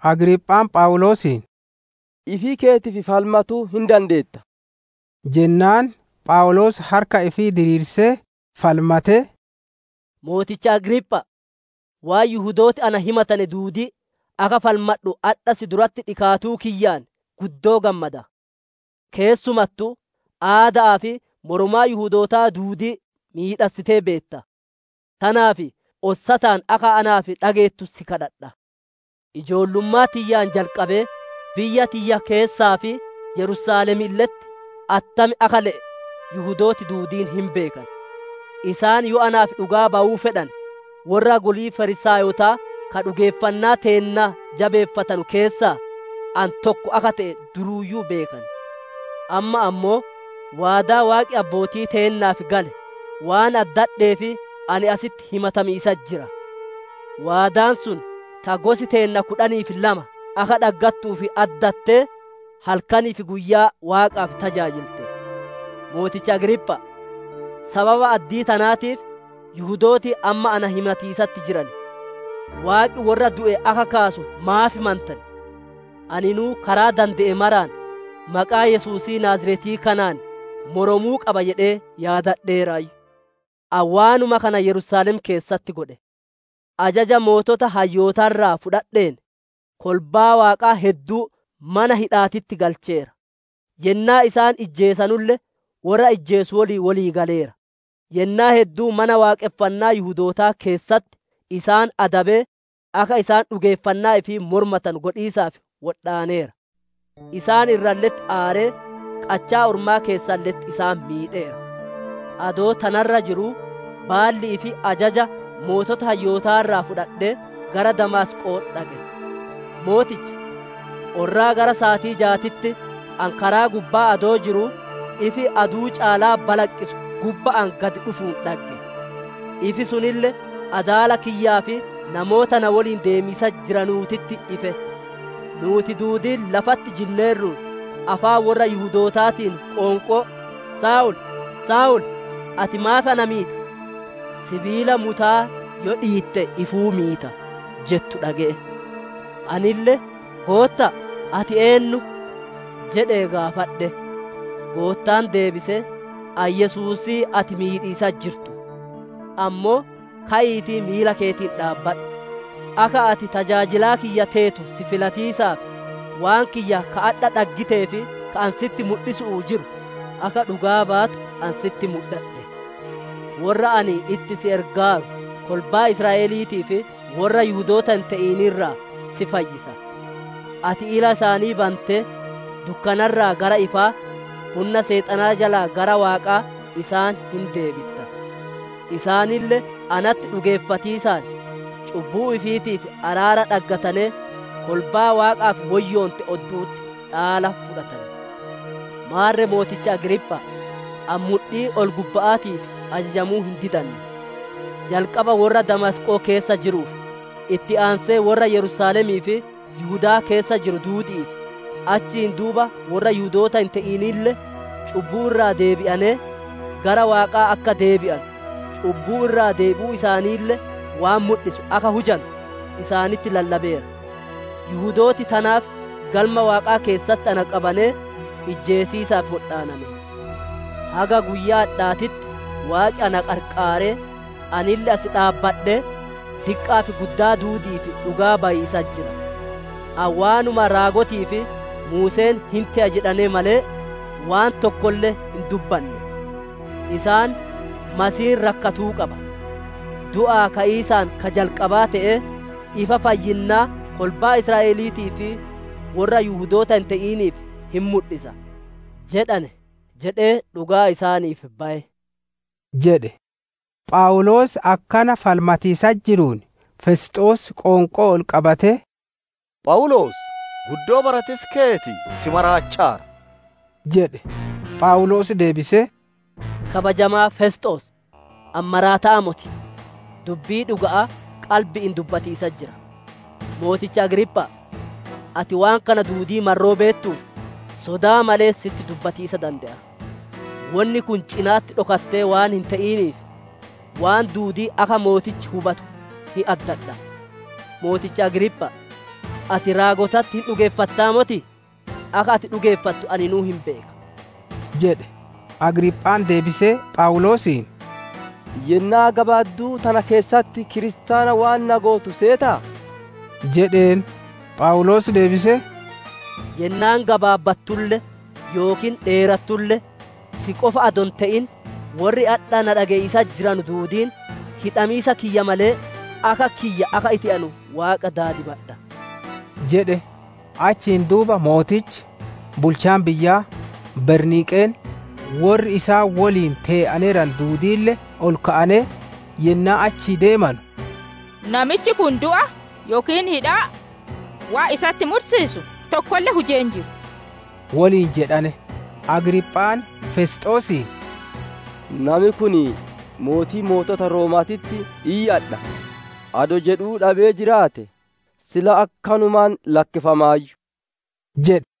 Agriiphaan Phawuloosiin, «Ifii keetiif falmatuu hin dandeetta» jennaan, Phawuloos harka ifii diriirsee falmatee, «Mooticha Agriipha'a! Waan Yihudooti na himatane duudii akka falmadhu adha si duratti dhikaatuu kiyyaan guddoo gammada. Keessumattuu aada'aa fi moromaa Yihudootaa duudii miidhassitee beetta. Tanaaf ossataan akka naaf dhageettu si kadhadha. «Ijoollummaa tiyyaan jalqabee, biyya tiyya keessaa fi Yerusaalemille'etti attam akka le'e Yihudooti duudiin hin beekan. Isaan yoo naaf dhugaa bayuu fedhane, worra golii Fariisaayotaa ka dhugeeffannaa teenna jabeeffatanu keessaa, ani tokko akka te'e duruuyyuu beekan. Amma ammoo, waadaa Waaqi abbootii teennaaf gale, waan addadheef ani asitti himatamiisatti jira. Waadaan sun, ta gosi teenna kudhanii fi lama akka dhaggattuuf addattee, halkanii fi guyyaa Waaqaaf tajaajilte. Mooticha Agriipha'a! Sababa addii tanaatiif, Yihudooti amma na himatiisatti jiran. Waaqi worra du'e akka kaasuu, maaf mantan? «Aninuu karaa dande'e maraan, maqaa Yesuusii Naaziretii kanaan mormuu qaba jedhee, yaadadheeraayyu. Ani waanuma kana Yerusaalem keessatti godhe. Ajaja sooreyyii hayyootaa irraa fudhadheen, kolbaa Waaqaa hedduu mana hidha'aatitti galcheera; yennaa isaan ijjeesanulle, worra ijjeesu woliin wolii galeera. Yennaa hedduu Mana Waaqonfannaa Yihudootaa keessatti isaan adabee, akka isaan dhugeeffannaa ifii mormatanu godhiisaaf wodhaaneera. Isaan irralle'etti aaree, qachaa ormaa keessalle'etti isaan miidheera. «Adoo tana irra jiruu baalli'ii fi ajaja sooreyyii hayyootaa irraa fudhadhee, gara Damaasqo'oo dhaqe. Mooticha! Orraa gara saatii jaatitti ani karaa gubbaa adoo jiruu, ifi aduu caalaa balaqqisu gubba'aan gadi dhufuun dhagge; ifi sunille adaala kiyyaa fi namoota na woliin deemiisatti jiranuutitti ife. Nuuti duudiin lafatti jinneerruun, afaan worra Yihudootaatiin qoonqoo, ‹Saa'ol! Saa'ol! Ati maaf na miita? Sibiila mutaa yoo dhiitte ifuu miita› jettu dhage'e. Anille, ‹Gootta'a, ati eennu?› jedhee gaafadhe. Goottaan deebisee, ‹Ani Yesuusii ati miidhiisatti jirtu. Ammoo ka'iitii miila keetiin dhaabbadhu. Akka ati tajaajilaa kiyya teetu si filatiisaaf, waan kiyya ka adha dhaggitee fi ka ani sitti mudhisu'uu jiru, akka dhugaa baatu ani sitti mudhadhe. Worra ani itti si ergaaru kolbaa Israa'eliitii fi worra Yihudoota hin te'in irraa si fayyisa. Ati ila isaanii bantee, dukkana irraa gara ifaa, hunna Seexanaa jalaa gara Waaqaa isaan hin deebitta; isaanille natti dhugeeffatiisaan, cubbuu ifiitiif araara dhaggatanee, kolbaa Waaqaaf woyyoonte oddu'utti dhaala fudhatan› jedhe. «Maarre mooticha Agriipha'a, ani mudhii ol-gubba'aatiif ajajamuu hin didanne. Jalqaba worra Damaasqoo keessa jiruuf, itti aansee worra Yerusaalemii fi Yihudaa keessa jiru duudi'iif, achiin duuba worri Yihudoota hin te'inille cubbuu irraa deebi'anee, gara Waaqaa akka deebi'anu, cubbuu irraa deebi'uu isaaniille waan mudhisu akka hujanu, isaanitti lallabeera. Yihudooti tanaaf Galma Waaqaa keessatti na qabanee, ijjeesiisaaf wodhaanane. Haga guyyaa adhaatitti Waaqi na qarqaaree, anille as dhaabbadhee, diqqa'aa fi guddaa duudi'iif dhugaa bayiisatti jira. Ani waanuma raagotii fi Muuseen hin te'a jedhane malee, waan tokkolle hin dubbanne. Isaan, ‹Masiihiin rakkatuu qaba; du'aa ka'iisaan ka jalqabaa te'ee, ifa fayyinnaa kolbaa Israa'eliitii fi worra Yihudoota hin te'iniif hin mudhisa› jedhane, jedhee dhugaa isaaniif baye» jedhe. Phawuloos akkana falmatiisatti jiruun, Fesxoos qoonqoo ol qabatee, «Phawuloos! Guddoo baratiisi keeti si maraachaara!» jedhe. Phawuloos deebisee, «Kabajamaa Fesxoos! Ani maraata'aa moti! Dubbii dhuga'aa qalbi'iin dubbatiisatti jira. Mooticha Agriipha'a! Ati waan kana duudii marroo beettuuf, sodaa malee sitti dubbatiisa dande'a. Wonni kun cina'atti dhokattee waan hin te'iniif, waan duudii akka mootichi hubatu hin addadha. Mooticha Agriipha'a! Ati raagotatti hin dhugeeffattaa motii? Akka ati dhugeeffattu aninuu hin beeka» jedhe. Agriiphaan deebisee, Phawuloosiin, «Yennaa gabaadduu tana keessatti kiristaana waan na gootu seetaa?» jedheen. Phawuloos deebisee, «Yennaan gabaabbattulle yookiin dheerattulle, si qofa adoo hin te'in worri adha na dhage'iisatti jiranu duudiin, hidhamiisa kiyya malee, akka kiyya akka ite'anu Waaqa daadimadha» jedhe. Achiin duuba Mootichi, bulchaan biyyaa, Berniiqeen, worri isaan woliin tee'aneeranu duudiille ol ka'anee, yennaa achii deemanu, «Namichi kun du'a yookiin hidhaa waan isatti mursiisu tokkolle hujee hin jiru» woliin jedhane. Agriiphaan, Fesxoosiin, «Nami kun ‹Mootii Mootota Rooma'aatitti iyyadha› adoo jedhuu dhabee jiraate, sila akkanumaan lakkifamaayyu» jedhe.